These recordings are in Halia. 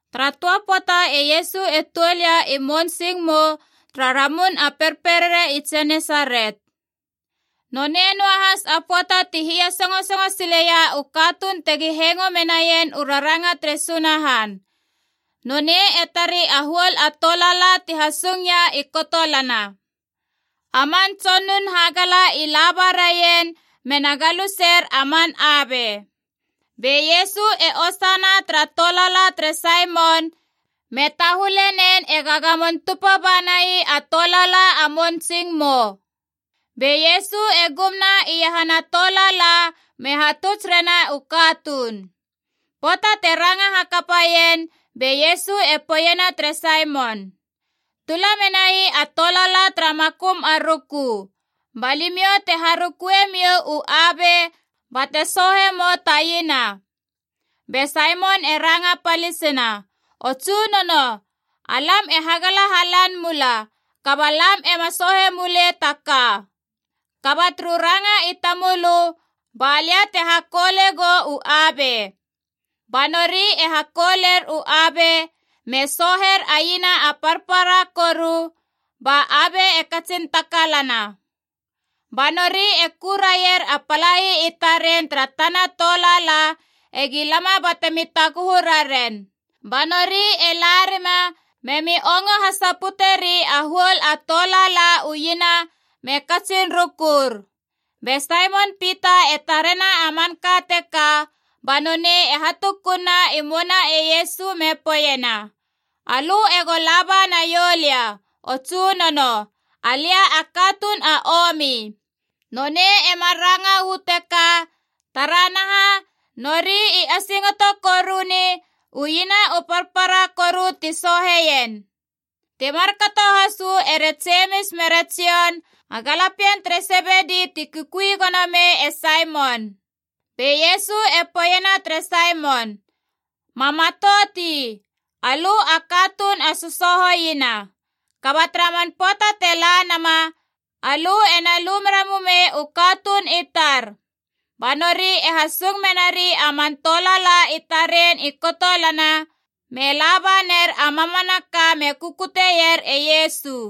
Tara töa pöata e Iesu e tuol ia i mounsingmou tara Ramun a Perperere i Genesaret. Nonei noa has a pöata ti hiasösongo sileia u katuun tegi hengo menaien u raranga tere Sunahan. Nonei e tari a huol a tolaala ti hasung ia i kotolana. A man tsonun hagala i laba raien mena galuser a man abe. Be Iesu e osana tara tolaala tere Saimon, me tahule nen ega gamon tupa ba nai a tolaala a mounsingmou. Be Iesu e gumna iahana tolaala me hatuts rena u katuun. Pöata te ranga hakapaien, be Iesu e poeiena tere Saimon, “Tula menai a tolaala tara makum a ruku, ba limiou te harukue miou u abe bate soohe mou ta iena.” Be Saimon e ranga palisina, “O Tsunono, alam e hagala halan mula, kaba lam ema soohe mulei ta ka. Kaba turu ranga i tamölö ba lia te hakoule gou u abe.” Ba nori e hakouler u abe me sooher a iena a parpara koru, ba abe e katsin takalana. Ba nori e ku raier a palai i taren tara tana tolaala egi lama batemi taguhu raren. Ba nori e la rima memi ongo hasaputeri a huol a tolaala u iena me katsin rukur. Be Saimon Pita e tarena a manka teka, ba nonei e hatukunna i mouna e Iesu me poeiena, “Alö ego laba naiou lia, o Tsunono! Alia a katuun a omi!” Nonei emar ranga uu teka taranaha, nori i asingoto koruni u iena u parpara koru ti sooheien. Ti markato has uu ere Jemis mere Jon, a galapien tere Sebedi ti kukui gono mei e Saimon. Be Iesu e poeiena tere Saimon, “Ma matout ii. Alö a katuun a sosooho iena. Kaba tara man pöata te la nama, alö e na lu mera mumei u katuun i tar!” Ba nori e hasung menari a man tolaala i taren i kotolana, me laba ner a mamanaka me kukutier e Iesu.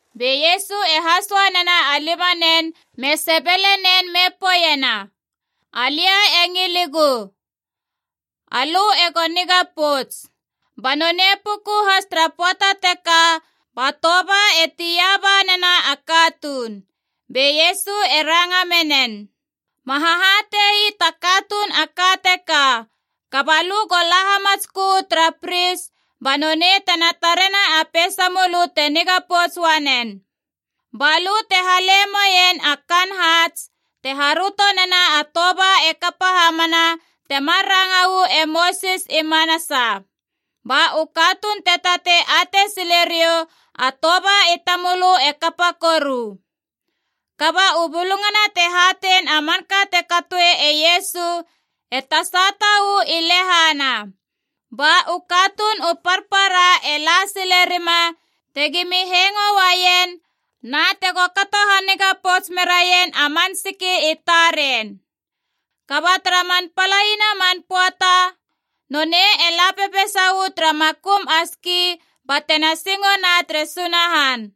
Be Iesu e hasoa nena a limanen me sebele nen me poeiena, “Alia e ngiligu. Alö ego niga pouts!” Ba nonei puku has tara pöata teka ba toba e tia ba nena a katuun. Be Iesu e ranga menen, “Ma hahate ii ta katuun a ka teka, kaba lö go la hamatskö uu tara pris ba nonei tena tarena a peisamölö te niga pouts uanen. Ba lö te hale moien a kaan haats te haröto nena a toba e kapa hamana, temar ranga uu e Mosis i manasa. Ba u katuun te tatei atei sile riou a toba i tamölö e kapa koru.” Kaba u bulungana te hatein a manka te katoe e Iesu e tasata uu i lehana. Ba u katuun u parpara e la sile rima tegimi hengo uaien na tego kato haniga pouts meraien man siki i taren. Kaba tara man palaina man pöata nonei e la pepeisa uu tara makum a ski batena singona tere Sunahan.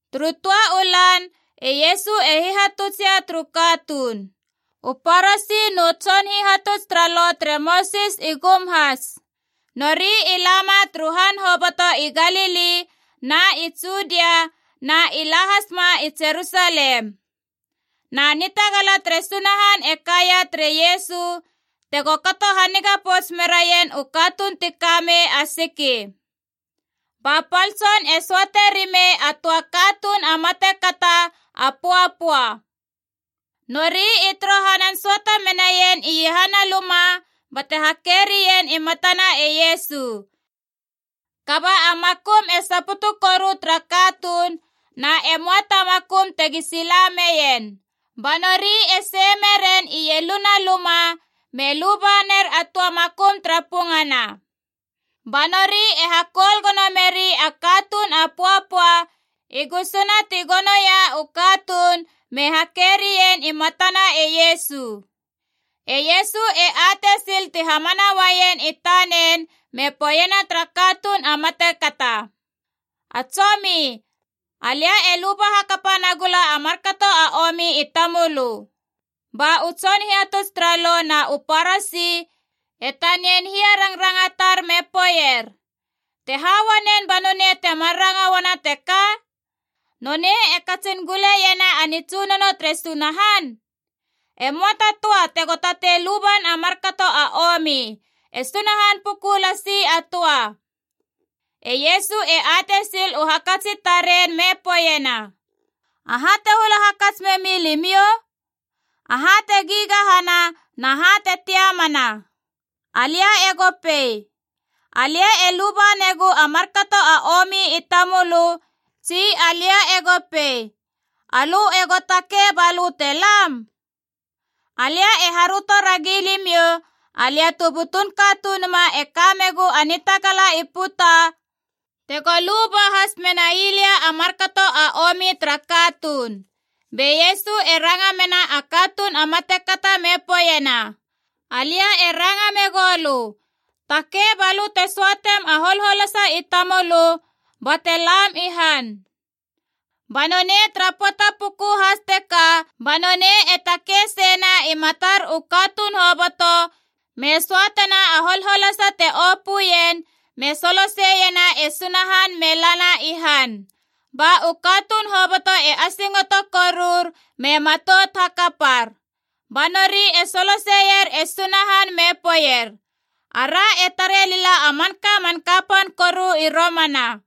Turu töa u lan e Iesu e hihatutsia turu katuun. U Parasi nu tson hihatuts tara Lo tere Mosis i gum has. Nori i lama turu han hoboto i Galili na i Judia na i la hasma i Jerusalem. Na nitagala tere Sunahan e kaia tere Iesu tego kato haniga pouts meraien u katuun ti ka mei a siki. Ba pal tson e söate rimei a töa katuun a matekata a pöapöa. Nori i torohanan söata menaien iahana luma bate hake rien i matana e Iesu. Kaba a makum e saputu koru tara katuun, na e möa ta makum tegi sila meien. Ba nori e sei meren ieluna a luma me luba ner a töa makum tara pungana. Ba nori e hakoul gono meri a katuun a pöapöa i gusuna ti gonoia u katuun me hakerien i matana e Iesu. E Iesu e atei sil ti hamana uaien i tanen me poeiena tara katuun a matekata, “A tsomi, alia e luba hakap nagula a markato a omi i tamölö.” Ba u tson hihatuts tara Lo na u Parasi e tanian hiarangrangatar me poeier, “Te ha uanen ba nonei temar ranga uana teka? Nonei e katsin guleiena a nitsunono tere Sunahan! E möa ta töa tego tatei luban a markato a omi, e Sunahan puku lasi a töa!” E Iesu e atei sil u hakats i taren me poeiena, “Aha te hula hakats memi limiou? Aha te gigahana na ha te tiamana? Alia ego pei, ‘Alia e luba negu a markato a omi i tamölö,’ tsi alia ego pei, ‘Alö ego takei ba lö te lam’? Alia e haröto ragi limiou, alia tu butun Katunuma e ka megu a nitagala i puta tego luba has menai lia a markato a omi tara katuun.” Be Iesu e ranga mena a katuun a matekata me poeiena, “Alia e ranga megou lö, takei, ba lö te söatem a holholasa i tamölö bate laam i han!” Ba nonei tara pöata puku has teka ba nonei e takei seina i matar u katuun hoboto me söatena a holholasa te opöien me soloseiena e Sunahan me lana i han. Ba u katuun hoboto e asingoto korur me matout hakapar. Ba nori e soloseier e Sunahan me poeier, “Ara e tare lila a manka man kapan koru i romana!”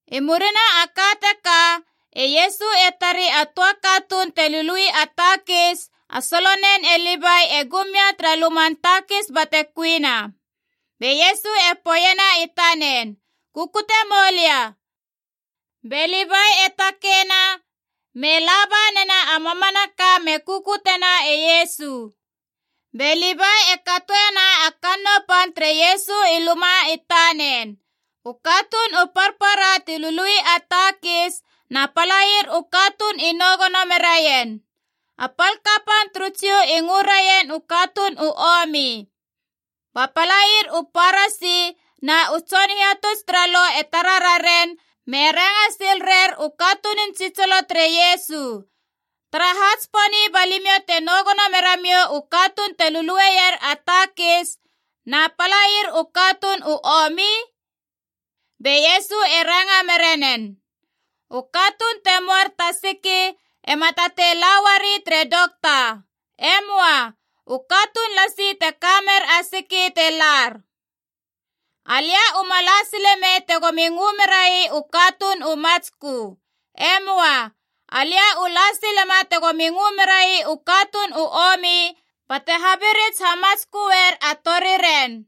I murina a ka teka, e Iesu e tari a töa katuun te lului a takis a solonen e Livai e gumia tara luman takis bate kuina. Be Iesu e poeiena i tanen, “Kukute moulia.” Be Livai e takeina me la ba nena a mamanaka me kukutena e Iesu. Be Livai e katoena a kannou pan tere Iesu i luma i tanen. U katuun u parpara ti lului a takis na palair u katuun i nou gono meraien. A pal kapan turu Jiu i ngö raien u katuun u omi. Ba palair u Parasi na u tson hihatuts tara Lo e tara raren me ranga sil rer u katunun tsitsilo tere Iesu, “Taraha tsiponi ba limiou te nou gono mera miou u katuun te lulueier a takis na palair u katuun u omi?” Be Iesu e ranga mera nen, “U katuun te möar ta siki ema tatei la uari tere dokta. E möa. U katuun lasi te ka mer a siki te lar. Alia u ma la sile mei tegomi ngö merai u katuun u matskö. E möa. Alia u la silema tegomi ngö merai u katuun u omi bate habirits hamatsköer a toriren.”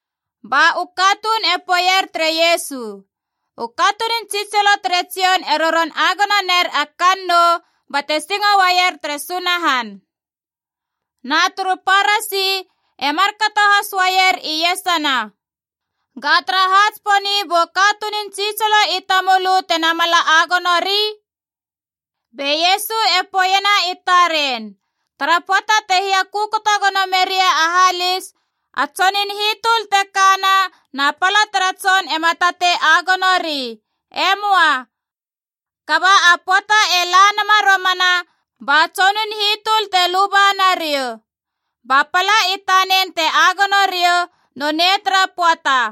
Ba u katuun e poeier tere Iesu, “U katunun tsitsilo tere Jon e roron agono ner a kannou bate singo uaier tere Sunahan. Na turu Parasi e markato has uaier iesana. Ga taraha tsiponi bu katunun tsitsilo i tamölö te namala agonori?” Be Iesu e poeiena i taren, “Tara pöata te hiakökoto gono meria a halis, a tsonun hitöl te kana na pala tara tson ema tatei agonori. E möa. Kaba a pöata e la nama romana ba tsonun hitöl te luba nariou. Ba pala i tanen te agono riou nonei tara pöata.”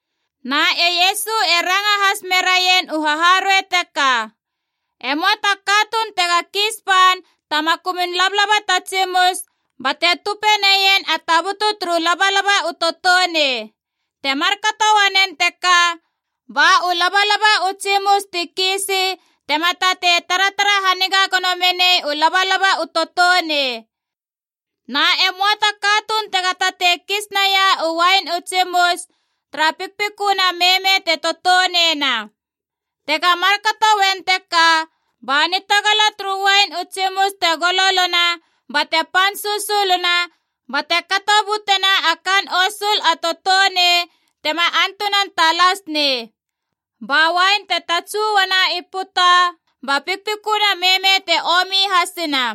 Na e Iesu e ranga has meraien u haharuei teka: “E möa ta katuun tega kiis ban ta makumun labalaba ta tsimus bate tupe neien a tabutu turu labalaba u toutounei. Te markato uanen teka, ba u labalaba u tsimus ti kiisi tema tatei taratara haniga gono menei u labalaba u toutounei. Na e möa ta katuun tega tatei kis naia u uain u tsimus tara pikpiköna meme te toutouneina. Tega markato uen teka, ba nitagala turu uain u tsimus te gololona bate pan susuluna, bate kato butena a kaan osul a toutounei tema antunan talas nei. Ba uain te tatsu uana i puta, ba pikpiköna meme te omi hasina.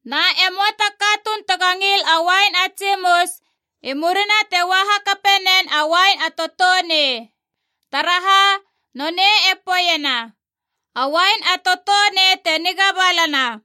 Na e möa ta katuun tega ngil a uain a tsimus i murina te ua hakape nen a uain a toutounei. Taraha? Nonei e poeiena, ‘A uain a toutounei te niga balana.’”